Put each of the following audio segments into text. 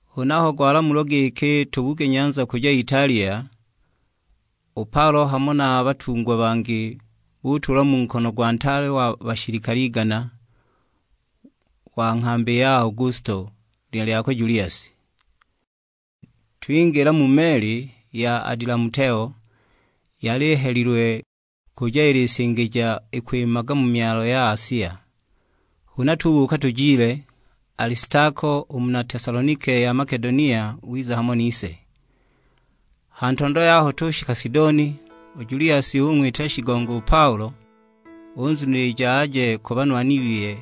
Huna aho gwalamulwa giki tubuge nyanza kuja Italia, u Paulo hamo na batungwa bangi butuulwa mu nkono gwa ntaale wa bashilikale igana, wa nghambi ya Augusto; lina lyakwe Juliasi. Twingila mu meli ya Adilamuteo, yali ihelilwe kuja ilisingija ikwimaga mu myalo ya Asia. Huna tubuuka tujile; Alistako u muna Tesalonike ya Makedonia wiza hamo nise. Ha ntondo yaho tushika Sidoni, u Juliasi ung'witila shigongo u Paulo, unzunilija aje ku banwani biye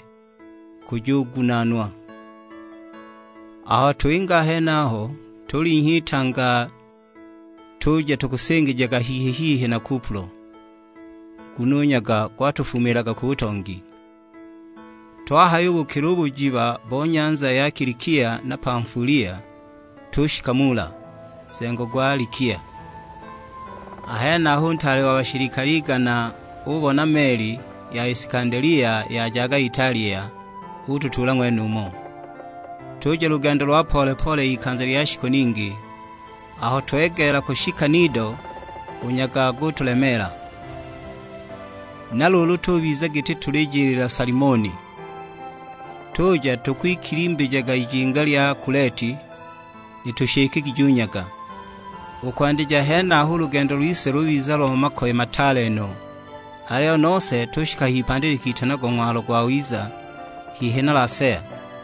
kujugunaanwa. Aho twinga a henaho, tulinhya itanga tuja tukusingijaga hihi-hihi na Kupulo, nguno u nyaga gwatufumiilaga ku butongi. Twahayubukila u bujiba bo nyanza ya Kilikia na Pamfulia, tushika Mula, nzengo gwa Likia. A henaho u ntaale wa bashilikale igana ubona meli ya Isikandelia yajaga Italia, ututuula ng'wenumo. Tuja lugendo lwa pole-pole ikanza lya shiku ningi; aho twegeela kushika Nido, u nyaga gutulemeela. Na luulu tubiza giti tulijiliila Salimoni, tuja tukwikilimbijaga ijinga lya Kuleti, litushikigije u nyaga. U kwandija henaho u lugendo lwise lubiza lo makoye mataale no, aliyo nose tushika h'ipandi litanagwa Ng'walo Gwawiza, hihi na Lasea.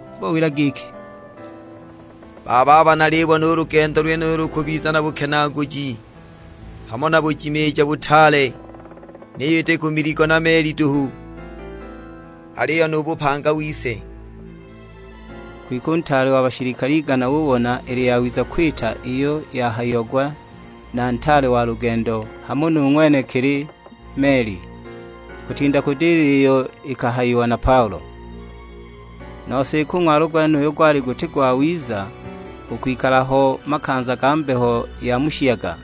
Ubawila giki, "Bababa nalibona u lugendo lwenulu lukubiza na bukenaaguji hamo na bujimiija butaale; niyo iti ku miligo na meli duhu, aliyo nu bupanga wise!" Kwike u ntaale wa bashilikale igana ubona ili yawiza kwita iyo yahayiagwa na ntaale wa lugendo hamo nu ng'wenekili meli, kutinda kudilila iyo ikahayiwa na Paulo. Nose iki u ng'walo gwenuyo gwali guti gwawiza u kwikala ho mu makanza ga mbeho ya mu shiyaga,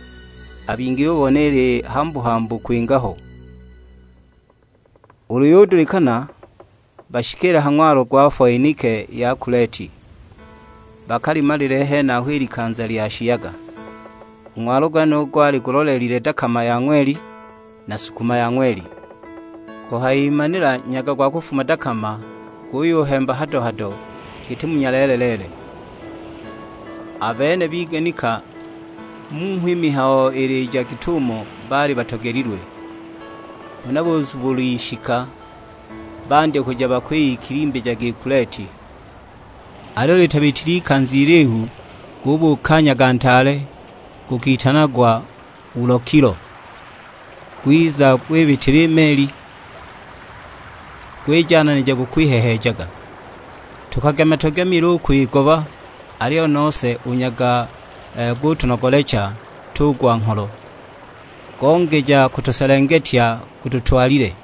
a bingi bubona ili hambu-hambu kwinga ho. Ulu yudulikana bashikiile ha ng'walo gwa Foenike ya Kuleti, bakalimalile henaho i likanza lya shiyaga. U ng'walo gwenuyo gwali gulolelile dakama ya ng'weli na sukuma ya ng'weli. Kuhayimanila nyaga gwa kufuma dakama, guyuhemba hado-hado, giti mu nyaleele-leele. A bene biganika giki mmho i mihayo ilija git'umo baali batogelilwe; huna buzubula ishika, bandya kuja bakwiyikilimbijaga i Kuleti. Aliyo litabitile ikanza ilihu gubuuka nyaga ntaale, gukitanagwa Ulokilo; gwiza gwibitila i meli, gwijananija gukwiheheejaga. Tukagema tugemile u kwigoba, aliyo nose u nyaga gutunogolecha, tugwa ngholo; gongeja kutuselengetya gututwalile!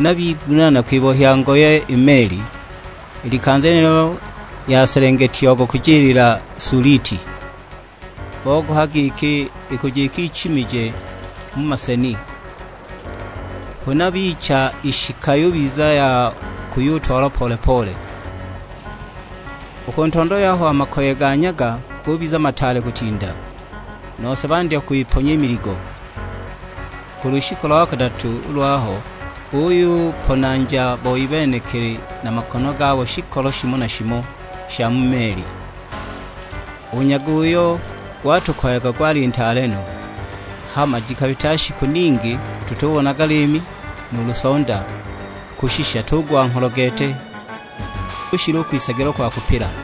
Huna bigunaana kwibohya ngoye i meli. I likanza lyenilo yaselengetiagwa kujiliila Suliti. Bogoha giki ikuja ikichimije mu maseni, huna bicha ishika yubiza ya kuyutwalwa pole-pole. U ku ntondo yaho a makoye ga nyaga gubiza mataale kutinda, nose bandya kwiponya i miligo. Ku lushiku lo kadatu lwaho buyuponanja boi benekili na makono gabo shikolo shimo na shimo sha mu meli. U nyaga uyo gwatukoyaga gwali ntaale no; hama jikabita shiku ningi tutubonaga liimi nuulu sonda, kushisha tugwa ngholo gete; kushila u kwisagilwa kwa kupila!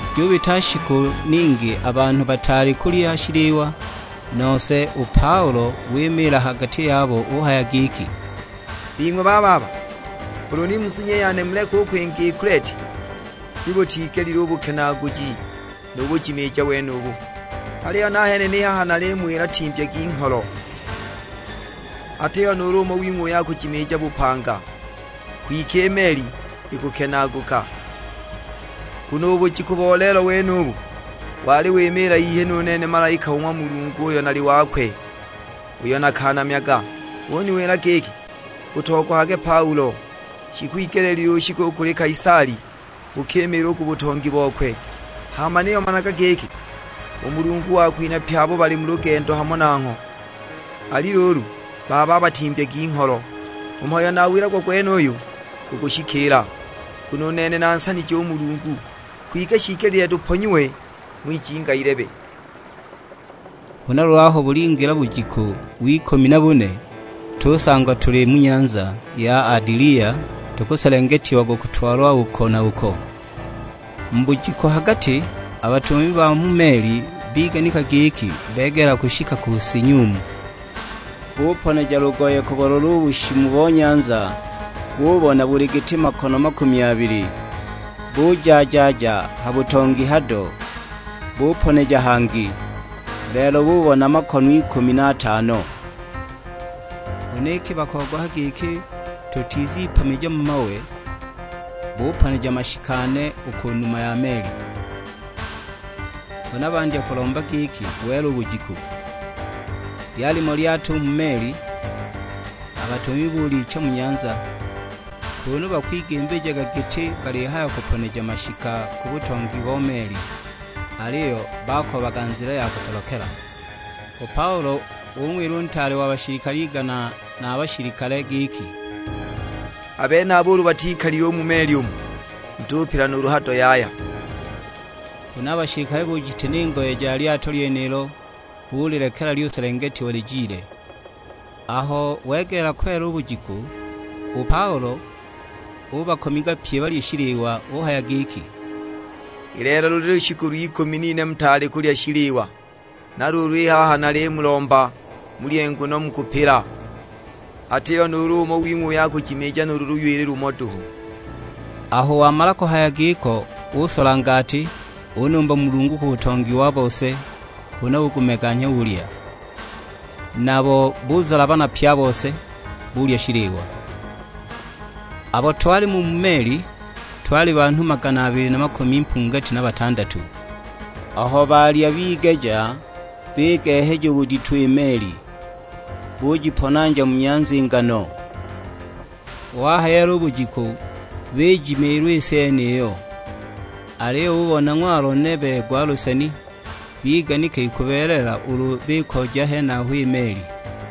Jubita shiku ningi a banhu bataali kulya shiliwa, nose u Paulo wimiila ha gati yabo uhaya giki, "Bing'we bababa, ulu ni muzunye i yane muleke u kwinga i Kuleti, ni butigelile u bukenaaguji nu bujimiija wenubu. Aliyo nahene ni haha nalimuwila timbyagi ngholo, atiho nuulu umo wing'we uyo akujimiija bupanga; gwike i meli ikukenaaguka! Nguno u bujiku bo lelo wenubu wali wimiila hihi nu nene malaika o ng'wa Mulungu uyo nali wakwe, uyo nakanamyaga; uniwila giki, 'Utogohage Paulo, shikwigelile ushike u kuli Kaisali, ukimiile u ku butongi bokwe. Hama niyo managa giki, u Mulungu wakwinhaga pye abo bali mu lugendo hamo nangho.' Ali luulu bababa timbyagi ngholo; u mhayo uyo nawilagwa gwenuyo gukushikiila, nguno u nene nansanije u Mulungu. Kwike shiigelile tuponyiwe ng'wijinga ilebe." Huna luulu aho bulingila bujiku w'ikumi na bune, tusangwa tuli mu nyanza ya Adilia tukuselengetiagwa kutwalwa uko na uko. Mu bujiku ha gati a batumami ba mu meli biganika giki begeela kushika ku si nyumu. Buponeja lugoye kubulola u bushimu bo nyanza, bubona buli giti makono makumi abili, buja-ja-ja ha butongi hado, buponeja hangi; lelo bubona makono ikumi na atano. Huna iki bakogoha giki tutizipamija mu mawe, buponeja mashika ane u ku numa ya meli; huna bandya kulomba giki wele u bujiku. Lyalimo lyato u mu meli, a batumami buliicha mu nyanza, kunu bakwigimbijaga giti balihaya kuponeja mashika ku butongi bo meli, aliyo bakoobaga nzila ya kutolokela. U Paulo ung'wila u ntaale wa bashilikale igana na a bashilikale; giki, "A benaba ulu batikalile u mu meli umu, mutupila nuulu hado yaya!" Huna a bashilikale bujitina i ngoye ja lyato lyenilo bulilekela lyuselengetiwa lijile. Aho wegeela kwela u bujiku, u Paulo ubakomiga pye balye shiliwa; uhaya giki, "I lelo luli lushiku lw'ikumi n'ine mutaali kulya shiliwa. Na luulu i haha nalimulomba mulye nguno mukupila, atiho nuulu umo wing'we uyo akujimiija nuulu luywili lumo duhu." Aho wamala kuhaya giko usola ngati, unumba Mulungu ku butongi wa bose, huna ugumeganya ulya. Nabo buzalabana pye a bose, bulya shiliwa. Abo twalimo u mu meli, twali banhu magana abili na makumi mpungati na batandatu. Aho balya bigeja, bigeheja u budito i meli; bujiponanja mu nyanza i ngano. Wahayeela u bujiku, bijimiilwa i si yeniyo, aliyo bubona ng'walo nebe gwa luseni, biganika ikubeelela ulu bikoja henaho i meli.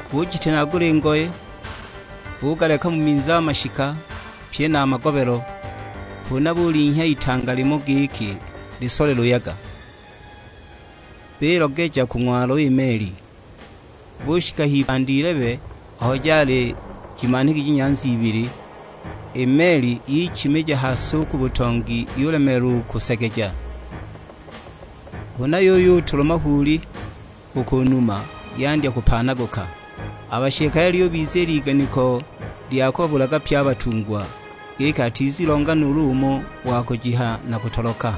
Bujitinagula i ngoye, bugaleka mu minzi a mashika, pye na a magobelo; huna bulinhya itanga limo giki lisole luyaga; bilogeja ku ng'walo i meli. Bushika h'ipandi ilebe aho jali jimanhigije nyanza ibili, i meli yichimija ha si u ku butongi yulemeelwa u kusegeja; huna yuyutulwa mahuuli u ku numa, yandya kupaanaguka. A bashilikale lyubiziila iganiko lya kubabulaga pye a batungwa, giki atizilonga nuulu umo wa kujiha na kutoloka.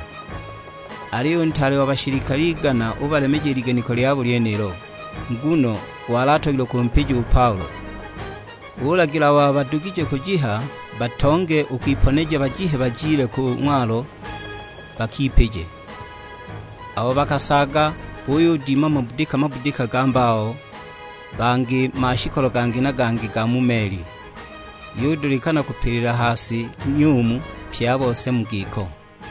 Aliyo u ntaale wa bashilikale igana ubalemeja i liganiko lyabo lyenilo, nguno wali atogilwe kumpija u Paulo. Ulagila abo badugije kujiha batonge u kwiponeja bajihe bajile ku ng'walo, bakipije. Abo bakasaaga buyudima mabudika-budika ga mbao, bangi mashikolo gangi-gangi ga mu meli. Yudulikana kupilila ha si nyumu pye a bose mu giko.